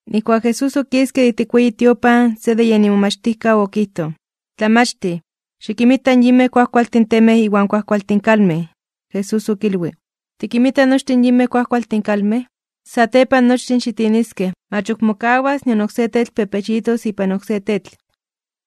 Nijkuak Jesús okiske de ijtik in weyi tiopan, se de yen imomachtijkaw okijtoj: ―¡Tlamachtij! Xikinmita in yinmej kuajkualtin temej iwan kuajkualtin kalmej. Jesús okilwij: ―¿Tikinmita nochtin yinmej kuajkualtin kalmej? Satepan nochtin xitiniskej, mach ok mokawas nion oksé tetl pepechitos ipan oksé tetl.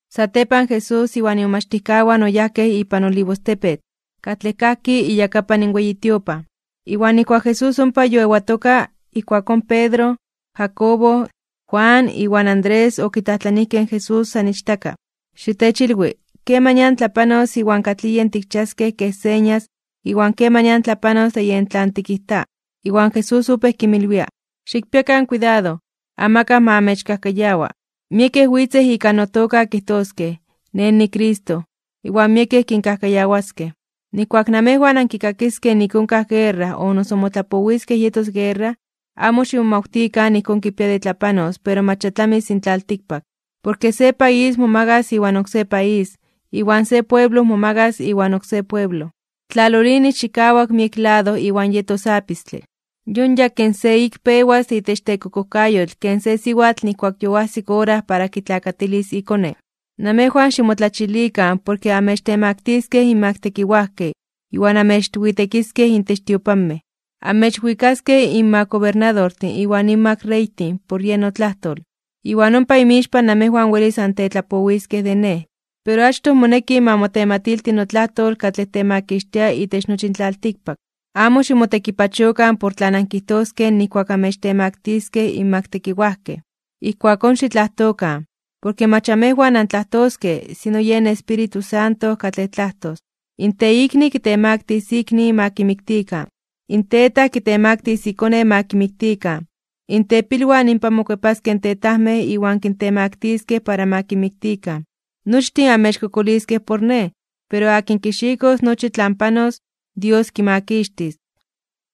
Satepan Jesús iwan imomachtijkawan oyajkej ipan Olivostepetl, katlej kajki iyakapan weyi tiopan. Iwan nijkuak Jesús ompa yoewatoka, ijkuakón Pedro, Jacobo, Juan iwan Andrés okitlajtlanijkej in Jesús san ichtaka: ―Xitechilwi, ¿kemanian tlapanos iwan katlij yen tikchiaskej kej señas iwan kemanian tlapanos de yen tlan tikijta? Iwan Jesús opéj kinmilwia: ―Xikpiakan kuidado, amakaj ma amechkajkayawa. Miekej witzej ika notoka kijtoskej: “Nej niCristo.” Iwan miekej kinkajkayawaskej. ’Nijkuak namejwan ankikakiskej nik onkaj guerra o noso motlapowiskej yetos guerra, amo ximomawtikan ijkón kipia de tlapanos pero mach ya tlamis in tlaltikpak. Porke se país momagas iwan oksé país, iwan se pueblo momagas iwan oksé pueblo. Tlalolinis chikawak miek lado iwan yetos apistle. Yon yakin se ik pewas de itech tekokojkayotl ken se siwatl nijkuak yoajsik ora para kitlakatilis ikone. ’Namejwan ximotlachilikan porke anmechtemaktiskej (omechtemaktiliskej) inmak tekiwajkej iwan anmechwitekiskej itech tiopanmej. Anmechwikaskej inmak gobernadortin iwan inmak reytin por yen notlajtol, iwan ompa inmixpan namejwan welis antetlapowiskej de Nej. Pero achtoj moneki ma motematilti notlajtol katlej temakixtia itech nochi in tlaltikpak. Amo ximotekipachokan por tlan ankijtoskej nijkuak amechtemaktiskej inmak tekiwajkej, ijkuakón xitlajtokan, porke mach amejwan antlajtoskej, sino yen Espíritu Santo katlej tlajtos. In teikni kitemaktis ikni ma kimiktikan, in tetaj kitemaktis ikone ma kimiktikan, in tepilwan inpan mokuepaskej in tetajmej iwan kintemaktiskej para ma kinmiktikan. Nochtin amechkokoliskej por Nej, pero akin kixikos nochi tlan panos, Dios kimakixtis.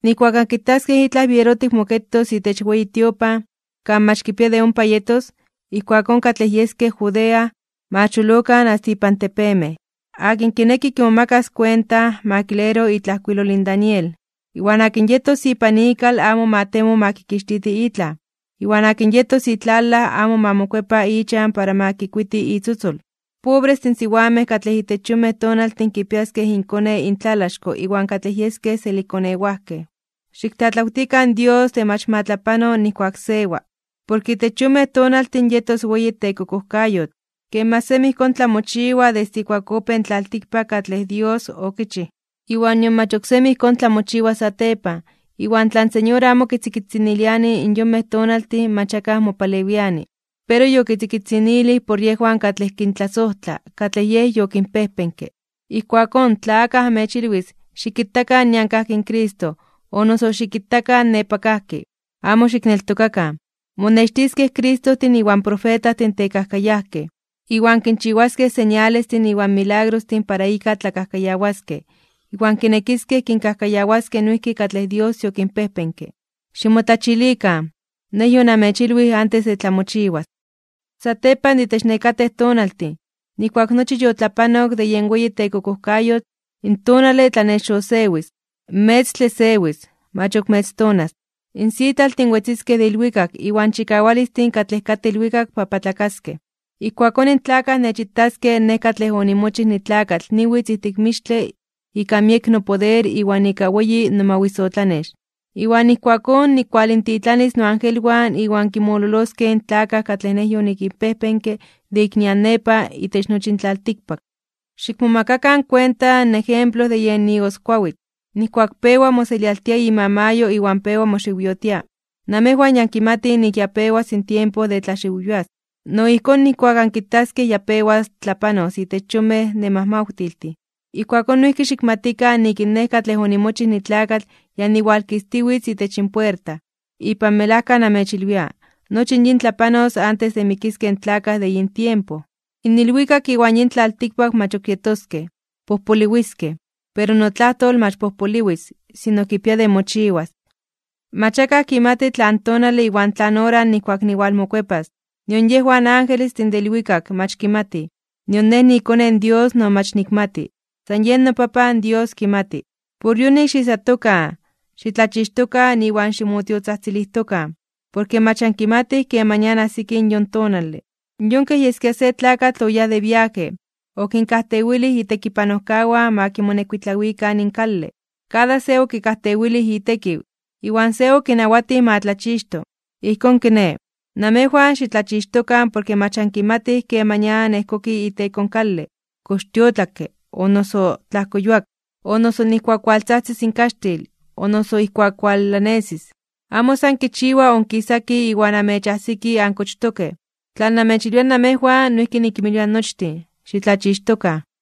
’Nijkuak ankitaskej itlaj bierotik moketos itech weyi tiopan, kan mach kipia de ompa yetos, ijkuakón katlej yeskej Judea, ma cholokan asta ipan tepemej. (Akin kineki kimomakas kuenta, ma kilero itlajkuilol in Daniel.) Iwan akin yetos ipan ikal amo ma temo ma kixtiti itlaj. Iwan akin yetos itlalaj amo ma mokuepa ichan para ma kikuiti itzotzol. ¡Pobrestin in siwamej katlej itech yonmej tonaltin kipiaskej inkone intlalaxko iwan katlej yeskej selikkonewajkej! Xiktlatlawtikan Dios de mach ma tlapano nijkuak sewa. Porke itech yonmej tonaltin yetos weyi tekokojkayotl, ken mach semi ijkón tlamochiwa desde ijkuak opéj in tlaltikpak katlej Dios okichij, iwan nion mach oksemi ijkón tlamochiwas satepan. Iwan tla in Señor amo kitzikitziniliani in yonmej tonaltin mach akaj mopalewiani. Pero yokitzikitzinilij por yejwan katlej kintlasojtla katlej Yej yokinpejpenke. ’Ijkuakón tla akaj amechilwis: “Xikitakan nian kajki in Cristo”, o noso “Xikitakan nepa kajki”, amo xikneltokakan. Monextiskej Cristojtin iwan profetajtin tekajkayajkej, iwan kinchiwaskej señalestin iwan milagrostin para ika tlakajkayawaskej, iwan kinekiskej kinkajkayawaskej noijki katlej Dios yokinpejpenke. ¡Ximotlachilikan! Nej yonamechilwij antes de tlamochiwas. ’Satepan de itech nekatej tonaltin, nijkuak nochi yotlapanok de yen weyi tekokojkayotl, in tonale tlanexosewis, in metztle sewis, mach ok metztonas. In sitlaltin wetziskej de ilwikak iwan chikawalistin katlej katej ilwikak papatlakaskej (bibiokaskej). Ijkuakón in tlakaj nechitaskej Nej katlej onimochij nitlakatl niwitz ijtik mixtle ika miek nopoder iwan ika weyi nomawisotlanex. Iwan ijkuakón nikinwalintitlanis noangelwan iwan kinmololoskej in tlakaj katlej Nej yonikinpejpenke de ik nian nepa itech nochi in tlaltikpak. ’Xikmomakakan kuenta in ejemplo de yen igoskuawitl: Nijkuak pewa moselialtia imamayo iwan pewa moxiwyotia, namejwan ya ankimatij nik ya pewas in tiempo de tlaxiwyoas. No ijkón nijkuak ankitaskej ya pewas tlapanos itech in yonmej nemajmawtiltin, ijkuakón noijki xikmatikan nik in Nej katlej onimochij nitlakatl ya niwalkistiwitz itech puerta. Ipan melajka namechilwia, nochi yin tlapanos antes de mikiskej in tlakaj de yin tiempo. In ilwikak iwan yin tlaltikpak mach ok yetoskej, pojpoliwiskej, pero notlajtol mach pojpoliwis, sino kipia de mochiwas. ’Mach akaj kimati tlan tonale iwan tlan ora nijkuak niwalmokuepas, nion yejwan angelestin de ilwikak mach kimatij, nion Nej niiKone in Dios no mach nikmati, san yen noPapan Dios kimati. ’Por yonik, xiijsatokan, xitlachixtokan iwan ximotiotzajtzilijtokan, porke mach ankimatij kemanian ajsiki in yon tonale. Yon kej yeskia se tlakatl oyáj de viaje, okinkajtewilij itekipanojkawan ma kimonekuitlawikan in kale, kada se okikajtewilij itekiw, iwan se okinawatij ma tlachixto. Ijkón kiné, namejwan xitlachixtokan porke mach ankimatij kemanian ejkoki iteko in kale, kox tiotlakke, o noso tlajkoyuak, o noso ijkuak waltzajtzis in kaxtil, o noso ijkuak walanesis. Amo san kichiwa onkisaki iwan anmechajsiki ankochtokej. Tlan namechilwia namejwan, noijki nikinmilwia nochtin: Xitlachixtokan.